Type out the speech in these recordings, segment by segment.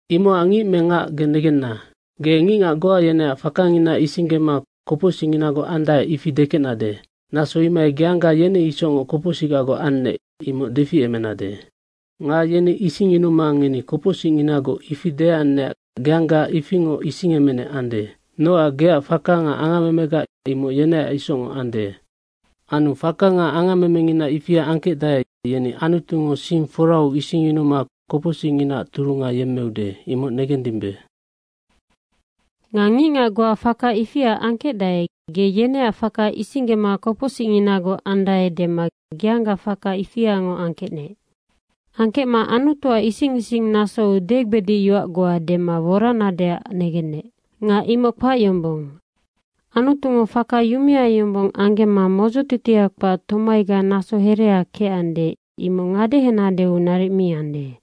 Imocac ngic me ngac, ge negenna, ge ngicngac goa yeneac fakangina isinggema kopocsicnginagoc andae, ifi dekecnade, naso imohai geangga yeni isocngoc kopocsicgagoc annec, imoc deficemenade. Nga yeni isingyunuma, “Ngeni kopocsicnginagoc.” ifi deannecac geangga ifingoc isingemenec ande. Nocac geac faka nga angammemega imoc yeneac isocngoc ande. Anu faka nga angammemengina ifia angkecdae, yeni Anutungo sing forau isingyunuma kopocsicnginaac turunga yemmeude, imoc negendimbe. Nga ngicngac goa faka ifia angkecdae, ge yeneac faka isinggema kopocsicnginagoc andae dema geangga faka ifiangoc angkecma Anutuac isic isinggenasou degbedic yoac goa dema woranadeac negennec nga imoc kpac yombong. Anutungo faka yumea yombong anggemma modzotitia kpac tomaiga naso herea kecande, imoc ngadehenadeu naric mi ande.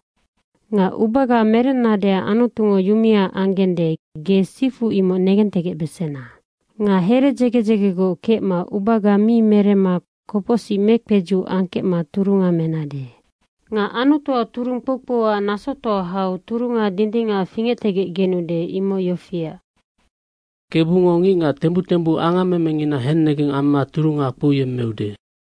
Nga ubaga merennadeac Anutungo yumea anggende, ge sifu imoc negentegecbesena. Nga here dzege dzegegoc kecma ubaga mi meremma kopocsic mekpedzuc angkecma turunga menade. Nga Anutuac turung kpoukpouac nasotoa hau turunga dindingac fingectegecgenude. Imoc yofiac, “Kebungo ngicngac tembuc tembuc angammemengina hennegeng amma turunga kpouyemmeude.”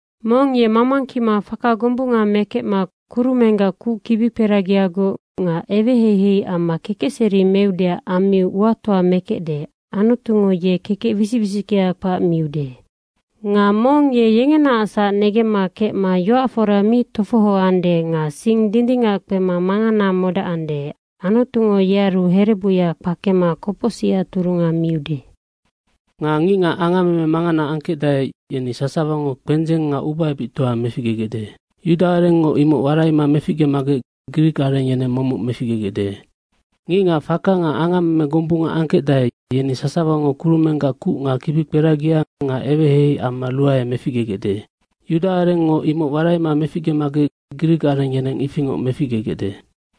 Mong ye mamangkima faka gombunga mekecma kurumenggac kuc kibikperagiagoc nga eweheihei amma kekecseri meudeac ammiu uatoa mekecde, Anutungo ye kekec wisic wisickea kpac miude. Nga mong ye yengenaacsac negemma kecma yoac fora mi tofohoande nga sing dindingac kpema mangana modacande, Anutungo yearu herebuya kpakema kopocsicac turunga miude. Nga ngicngac angammeme mangana angkecdae, yeni sasawango kpendzeng nga ubaebictoa meficgegecde. Yuda arengngo imoc waraima meficgemagec grik areng yeneng momoc meficgegecde. Ngicngac faka nga angammeme gombunga angkecdae, yeni sasawango kurumenggac kuc nga kibikperagia nga eweheihei amma ruae meficgegecde. Yuda arengngo imoc waraima meficgemagec grik areng yeneng ifingoc meficgegecde.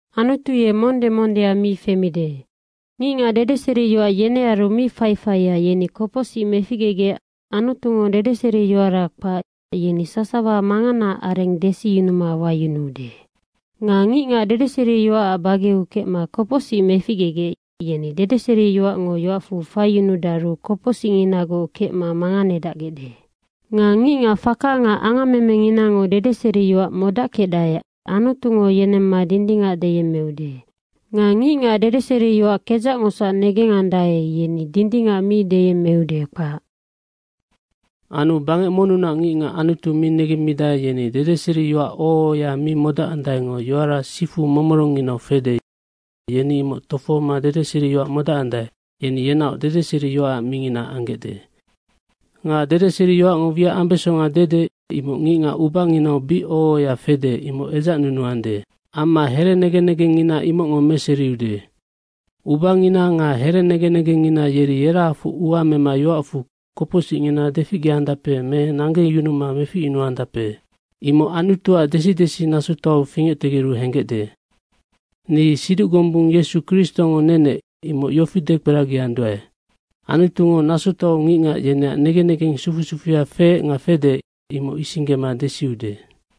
Anutu ye monde mondea mi femide. Ngicngac dedeseriyoac yenearu mi faifaia, yeni kopocsic meficgegec Anutungo dedeseriyoara kpac, yeni sasawa manganaac areng desiyunuma wayunuude. Nga ngicngac dedeseriyoacac bageau kecma kopocsic meficgegec, yeni dedeseriyoacngo yoacfu faiyunudaru kopocsicnginagoc kecma manganedacgecde. Nga ngicngac faka nga angammenginango dedeseriyoac modackecdae, Anutungo yenemma dindingac deyemmeude. Nga ngicngac dedeseriyoac kedzacngosac negengandae, yeni dindingac mi deyemmeude, kpac. Anu bangec monnunac ngicngac Anutu mi negemmidae, yeni dedeseriyoac oho ohoya mi modacandaengo yoara sifu momorongnginau fede, yeni imoc tofohoma dedeseriyoac modacandae, yeni yenaoc dedeseriyoacac mingina anggecde. Nga dedeseriyoacngo wiac ambesonga dede, imoc ngicngac ubanginau bic oho ohoya fede, imoc edzacnunuandae. Amma here negen negengngina imocngo meseriude. Ubangina nga here negen negengngina yeri yerahafoc ua mema yoacfu kopocsingngina deficgeandape me nanggeyunuma meficyunuandape. Imoc Anutuac desi desi nasotoau fingectegeru henggecde. Ni siduc gombung Yesu Kristongo nenec, imoc yofi dekperagianduae, Anutungo nasotoau ngicngac yeneac negen negeng sufu sufuya feec nga fede, imoc isinggema desiude.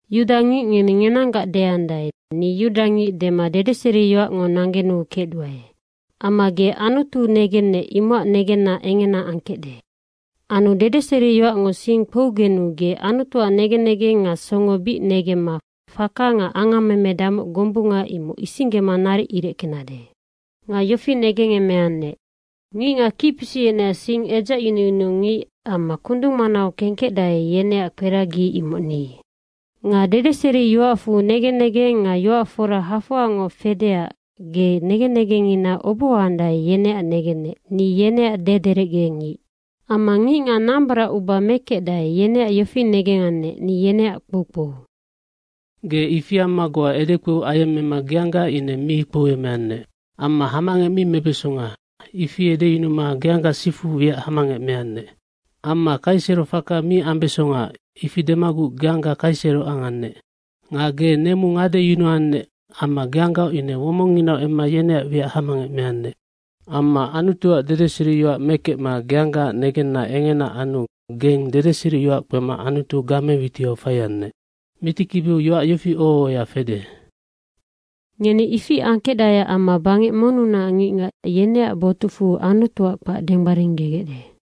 Yudangic ngeni ngenanggac deandae, “Ni yudangic dema dedeseriyoacngo nanggenuu kecduae.” Amma ge Anutu negennec imocac negenna engena angkecde. Anu dedeseriyoacngo sing kpougenu ge Anutuac negen negeng nga songo bic negemma faka nga angammeme damoc gombunga, imoc isinggema naric ireckenade. Nga yofi negengemeannec, “Ngicngac kicpisic yeneac sing edzacyunuyunu ngic amma kundung manau kengkecdae, yeneac kperagia, imoc ni.” Nga dedeseriyoacfu negen negeng nga yoac fora hafoangoc fedeac ge negen negengngina obohoandae, yeneac negennec, “Ni yeneac dederecgengic.” amma ngicngac nambaracuba mekecdae, yeneac yofi negengannec “Ni yeneac kpoukpou.” Ge ifi amma goa edekpou ayemmema geangga ine mi kpouemeannec. Amma hamangec mi mebesonga, ifi edeyunuma geangga sifu wiac hamangec meannec. Amma kaiserofaka mi ambesonga, ifi demaguc geangga kaisero angannec. Nga ge nemu ngadeyunuannec amma geanggaoc ine womonginau emma yeneac wiac hamangec meannec. Amma Anutuac dedeseriyoac mekecma geanggaac negenna engena anu gennoc dedeseriyoac kpema Anutu game witiau faiannec. Mitikibiu yoac yofi oho ohoya fede, “Ngeni ifi angkecdaeac amma bangec monnunac ngicngac, yeneac botucfu Anutuac kpac denggbaringgegecde.”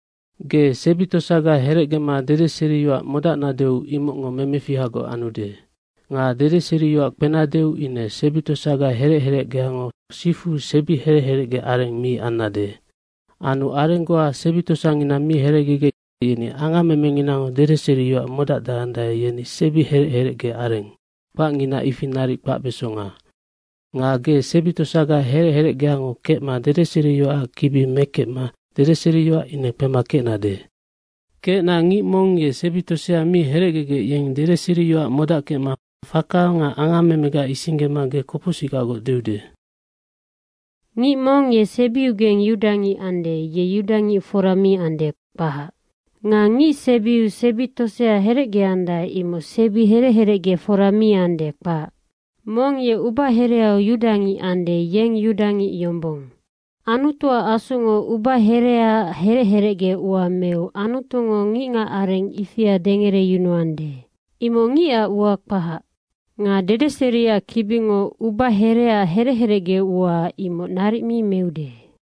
Ge sebi tosaga herecgema dedeseriyoac modacnadeu imocngo memefihagoc anude. Nga dedeseriyoac kpenadeu ine sebi tosaga herec herecgeango sifu sebi herec herecgea areng mi annade. Anu areng goa sebi tosangina mi herecgegec, yeni angammemenginango dedeseriyoac modacdacande, yeni sebi herec herecgeareng, kpacngina ifi naric kpacbesonga. Nga ge sebi tosaga herec herecgeango kecma dedeseriyoacac kibi mekecma dedeseriyoac ine kpema kecna ngic mong ye sebi tosea mi herecgegec, yeng dedeseriyoac modackecma faka nga angammemega isinggema ge kopocsicgaggoc deude. Ngic mong ye sebiugeng yudangic ande, ye yudangic fora mi ande, kpac. Nga ngicsebiu sebi tosea herecgeandae, imoc sebi herec herecge fora mi ande, kpac. Mong ye ubahereau yudangic ande, yeng yudangic yombong. Anutuac Asungo ubahereaac herec herecge ua meu Anutungo ngicngac areng ifia dengereyunuande, imoc ngicac ua kpahac. Nga dedeseriac kibingo ubahereac herec herecge ua, imoc naric mi meude.